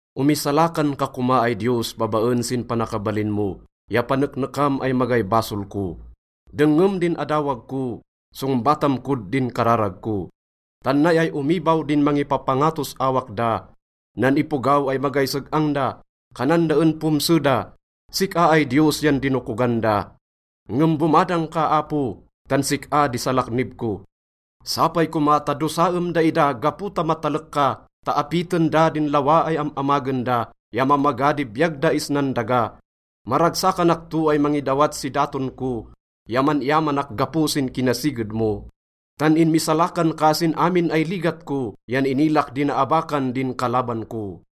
Omisalakan ka koma ay Diyos babaen sin panakabalin mo ya paneknekam ay magay basol ko. Dengngem din adawag ko, songbatam kod din kararag ko. Tan nay ay omibaw din mangipapangatos awak da. Nan ipogaw ay magay seg-ang da, kanan da en pomse da. Sik-a ay Diyos yan dinokogan da. Ngem bomadang ka, Apo, tan sik-a di salaknib ko. Sapay koma ta dosaem daida gapo ta matalek ka ta apiten da din lawa ay am-amagen da ya mamaga di biyag da isnan daga. Maragsakanak to ay mangidawat si daton ko ya man-iyamanak gapo sin kinasiged mo, tan inmisalakan ka sin amin ay ligat ko yan inilak di naabakan din kalaban ko.